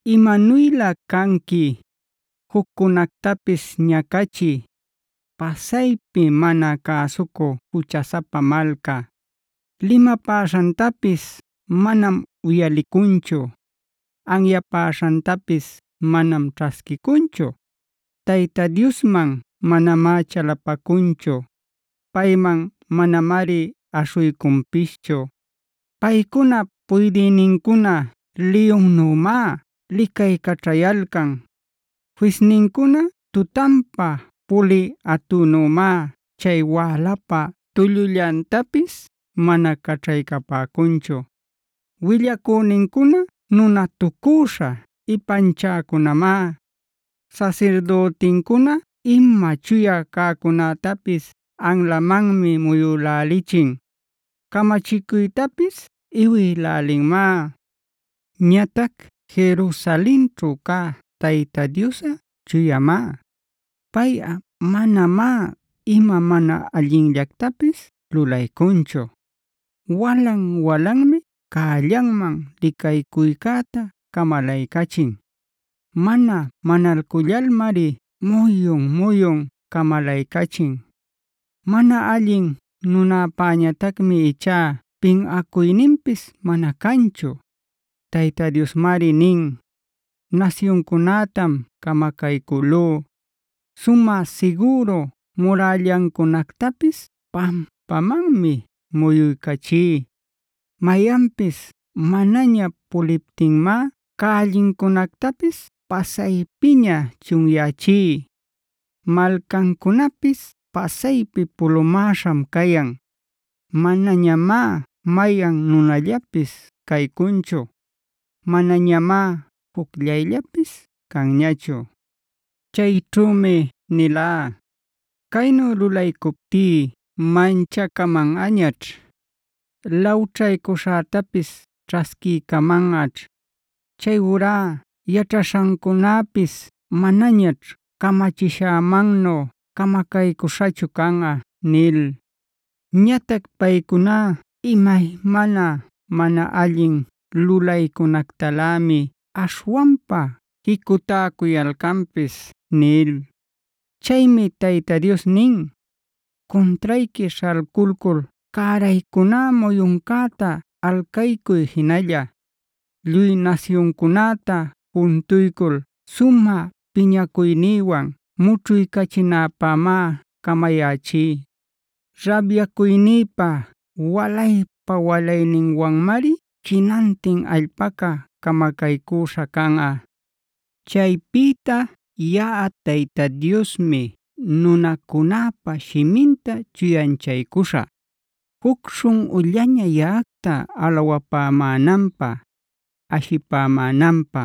¡Imanuylä canqui, juccunactapis ñacachï, pasaypi mana cäsucü juchasapa malca! Limapäśhantapis manam uyalicunchu, anyapäśhantapis manam ćhasquicunchu. Tayta Diosman manamá chalapacunchu, payman manamari aśhuycunpischu. Paycunap puydïnincuna liyunnümá licaycaćhayalcan; fisnincuna tutanpa pulï atünümá chay wälapä tullullantapis mana caćhaycapäcunchu. Willacünincuna nunatucüśha ipanchäcunamá. Sasirdütincuna ima chuya cäcunätapis anlamanmi muyülälichin, camachicuytapis iwïlälinmá. Ñatac Jerusalenćhu cä Tayta Diosꞌa chuyamá. Payꞌa manamá ima mana allinllactapis lulaycunchu. Walan-walanmi cällanman licaycuycäta camalaycachin. Mana manalcullalmari muyun-muyun camalaycachin. Mana allin nunäpañatacmi ichá pinꞌacuyninpis mana canchu. Tayta Diosmari nin: “Nasyuncunätam camacaycülú; sumä sigüru murällancunactapis pampamanmi muyuycachí. Mayanpis manaña puliptinmá cällincunactapis pasaypiña chunyächí. Malcancunapis pasaypi pulumäśham cayan. Manañamá mayan nunallapis caycunchu; manañamá jucllayllapis canñachu. Chayćhümi nilá: ‘Caynu lulaycuptí manchacamanꞌañaćh; lawćhaycuśhätapis ćhasquiycamanꞌañaćh. Chayurá yaćhaśhancunapis manañaćh camachishämannu camacaycüśhachu canꞌa’ nil. Ñatac paycuná imaymana mana allin lulaycunactalämi aśhwanpa jicutäcuyalcanpis” nil. Chaymi Tayta Dios nin: “Cuntrayqui śhalculcul cäraycuná muyuncäta alcaycuy jinalla. Lluy nasyuncunäta juntuycul sumä piñacuynïwan mućhuycachinäpämá camayächí. Rabyacuynïpa walaypa-walaynïwanmari jinantin allpaca camacaycüśha canꞌa. “Chaypïta yaꞌa Tayta Diosmi nunacunäpa shiminta chuyanchaycuśhä, juc śhunꞌullaña yaꞌacta alawapämänanpä, ashipämänanpä.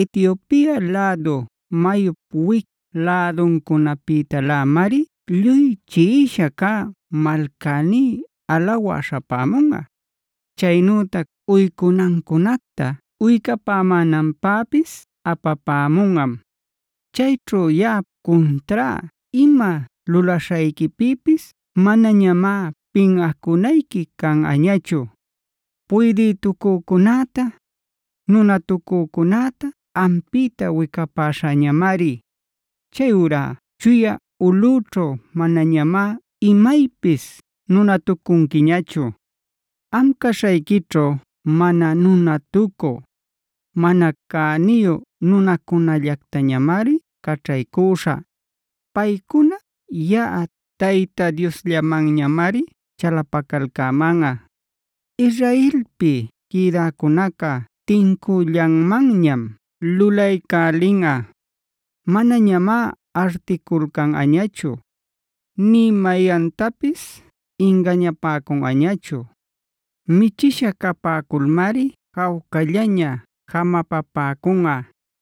Etiopia lädu mayup wic läduncunapïtalämari lluy chiꞌisha cä malcäní alawä śhapämunꞌa; chaynütac uycunancunacta uycapämänanpäpis apapämunꞌam. Chayćhu yaꞌap cuntrá ima lulaśhayquipïpis manañamá pinꞌacunayqui canꞌañachu. Puydïtucücunäta, nunatucücunäta ampïta wicapäśhäñamari. Chayurá chuya ulꞌüćhu manañamá imaypis nunatucunquiñachu. Am caśhayquićhu mana nunatucü, mana cäniyu nunacunallactañamari caćhaycüśhä. Paycuna yaꞌa Tayta Diosllamanñamari chalapacalcämanꞌa. Israelpi quïdäcunaca tincüllanmanñam lulaycälinꞌa; manañamá articulcanꞌañachu,a nï mayantapis ingañapäcunꞌañachu. Michisha capäculmari jawcallaña jamapapäcunꞌa,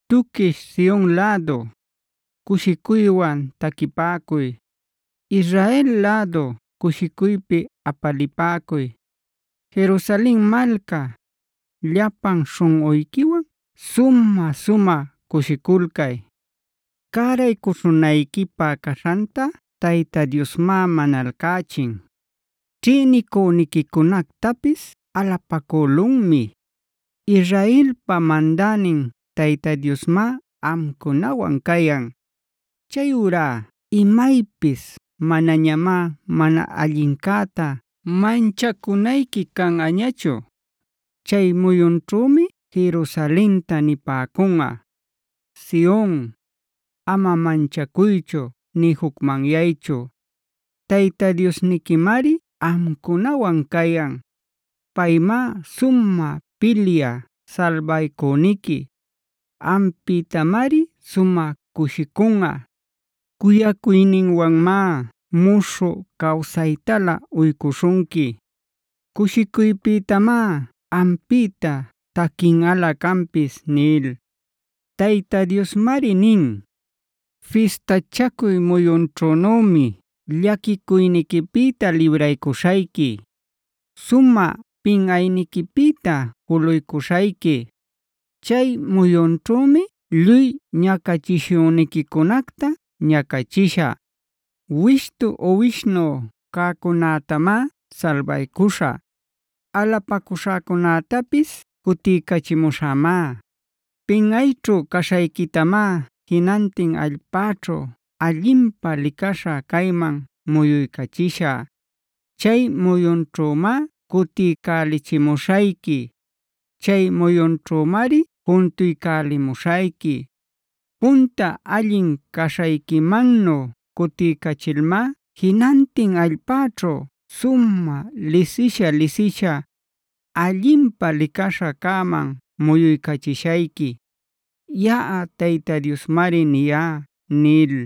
Tuquish Sion lädu, cushicuywan taquipäcuy. Israel lädu, cushicuypi apalipäcuy. Jerusalen malca, llapan śhunꞌuyquiwan sumä-sumä cushiculcay. Cäraycuśhunayquipä caśhanta Tayta Diosmá manalcächin; ćhïnicüniquicunactapis alapacülunmi. Israelpa mandänin Tayta Diosmá amcunawan cayan.c Chayurá imaypis manañamá mana allincäta manchacunayqui canꞌañachu. Chay muyunćhümi Jerusalenta nipäcunꞌa: “Sion, ama manchacuychu nï jucmanyaychu. Tayta Diosniquimari amcunawan cayan. Paymá sumä pilyä salbaycüniqui. Ampïtamari sumä cushicunꞌa; cuyacuyninwanmá muśhü cawsaytalä uycuśhunqui. Cushicuypïtamá ampïta taquinꞌalä canpis” nil. Tayta Diosmari nin: “Fistachacuy muyunćhünümi llaquicuyniquipïta libraycuśhayqui, sumä pinꞌayniquipïta juluycuśhayqui. Chay muyunćhümi lluy ñacachishüniquicunacta ñacachishä. Wishtu uwishnu cäcunätamá salbaycuśhä, alapacüśhacunätapis cutiycachimuśhämá.d Pinꞌayćhu caśhayquitamá jinantin allpäćhu allinpä licaśha cayman muyuycachishä. Chay muyunćhümá cutiycälichimuśhayqui; chay muyunćhümari juntuycälimuśhayqui. Punta allin caśhayquimannu cutiycachilmá jinantin allpäćhu sumä lisisha-lisisha, allinpä licaśha cäman muyuycachishayqui.e Yaꞌa Tayta Diosmari niyá” nil.